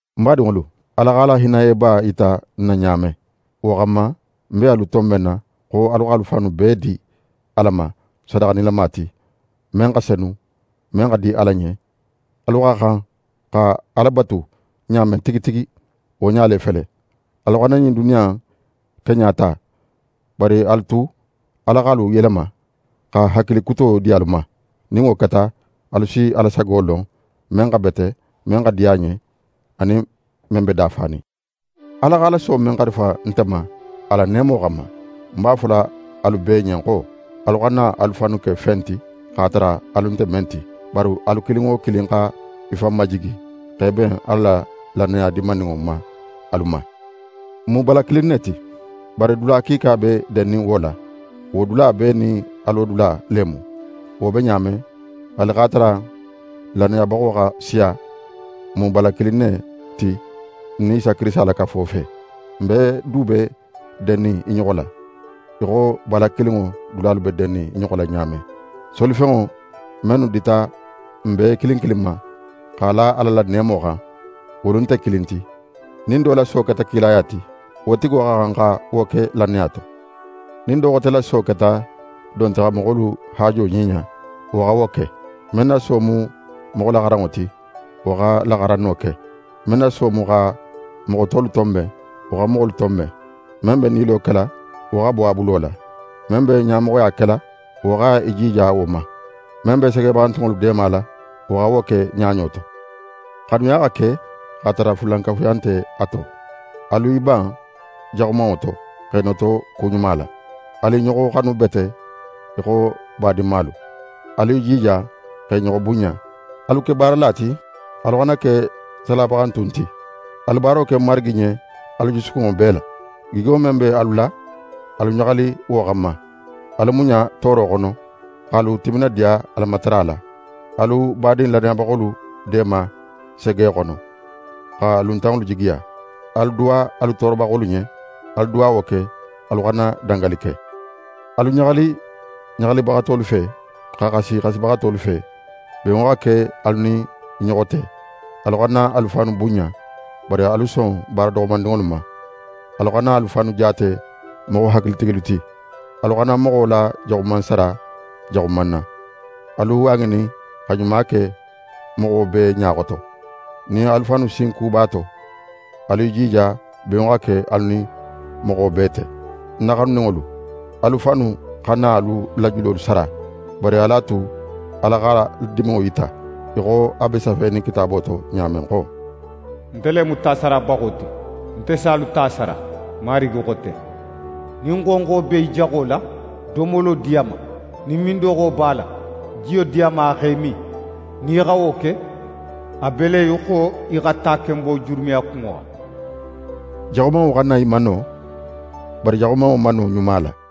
Ń badinŋolu, Ala x'a la hinnayeba yita n na ɲa men, wo xanma ń be alu tonbenna xo alu x'alu fannu bee di Ala ma sadaxa nilama ti, men xa senu, men xa di Ala ɲen. Alu xa xan xa Ala batu ɲa men tigi tigi, wo ɲa le fele. Alu xana ɲin duniya in keɲa ta, bari alu a tu Ala x'alu yelema, xa hakili kuto di alu ma. Nin wo keta, alu si Ala sago lon: Men xa bete, men xa di a ɲen, anin men be dafanin. Ala x'a la so men xarifa nte ma a la neemo xanma, ń b'a fola alu bee ɲen xo: Alu xana alu fannu ke fen ti, x'a tara alu nte men ti. Bari alu kilin wo kilin xa í fan majigi x'é ben Ala la lannaya dinmaninŋo ma alu ma. N mu bala kilin ne ti. Bari dula kiika be dennin wo la. Wo dula bee nin a lodula le mu. Wo be ɲa men, haali x'a tara n lannayabaxo xa siya, n mu bala kilin ne ti n nin Kirisita la kafo fe. N bee du be dennin i ɲoxo la, í xo bala kilinŋo dulalu be dennin i ɲoxo la ɲa men. Solifenŋo mennu dita n bee kilin kilin ma, x'a la Ala la neemo xan, wolu nte kilin ti. Nin do la so keta kilaya ti, wo tigo xa xan xa wo ke lannaya to. Nin do xote la so keta don ti xa moxolu haajo ɲiɲa, wo xa wo ke. Men na so mu moxolaxaranŋo ti, wo xa laxaranno ke. Men na so mu xa moxo tolu tonben, wo xa moxolu tonben. Men be nilo kela, wo xa bo a bulo la. Men be ɲamoxoya kela, wo xa í jija wo ma. Men be segebaxantunŋolu deemala, wo xa wo ke ɲaɲo to. Xanuya xa ke x'a tara fulankafuya nte a to. Alu i ban jaxumanŋo to, x'e noto ku ɲuma la. Alu i ɲoxo xanu bete í xo badinmalu. Alu i jija x'e ɲoxo bunɲa. Alu ke baarala ti, alu xana ke salabaxantun ti. Alu baaro ke Marigi ɲen alu jusukunŋo bee la. Gigo men be alu la, alu ɲaxali wo xanma. Alu muɲa tooro xono, x'alu timinadiya Alamatara la. Alu badin lannayabaxolu deema sege xono, xa luntanŋolu jigiya. Alu duwa alu toorobaxolu ɲen. Alu duwawo ke, alu xana dangali ke. Alu ɲaxali ɲaxalibaxatolu fe, xa xasi xasibaxatolu fe. Benŋo xa ke alu nin i ɲoxo te. Alu xana alu fannu bunɲa. Bari alu son baara doxomandinŋolu ma. Alu xana alu fannu jaate moxo hakilitigilu ti. Alu xana moxo la jaxuman sara jaxuman na. Alu a ŋinin xa ɲuma ke moxo bee ɲa xoto. Nin alu fannu sinku b'a to, alu i jija benŋo xa ke alu nin moxo bee te. Ń na xanuninŋolu, alu fannu xana alu la julolu sara, bari alu a tu Ala x'a la diminŋo yita, í xo a be safenin Kitaabo to ɲa men xo: «Nte le mu tasarabaxo ti, nte si alu ta sara; Marigi xo ten.» «Nin xonxo be í jaxo la, domolo di a ma. Nin mindoxo b'a la, jiyo di a ma a x'é min. Nin í xa wo ke, a be le í xo í xa takenbo jurumi a kunŋo xan.» Jaxumanŋo xana í mano; bari jaxumanŋo mano ɲuma la.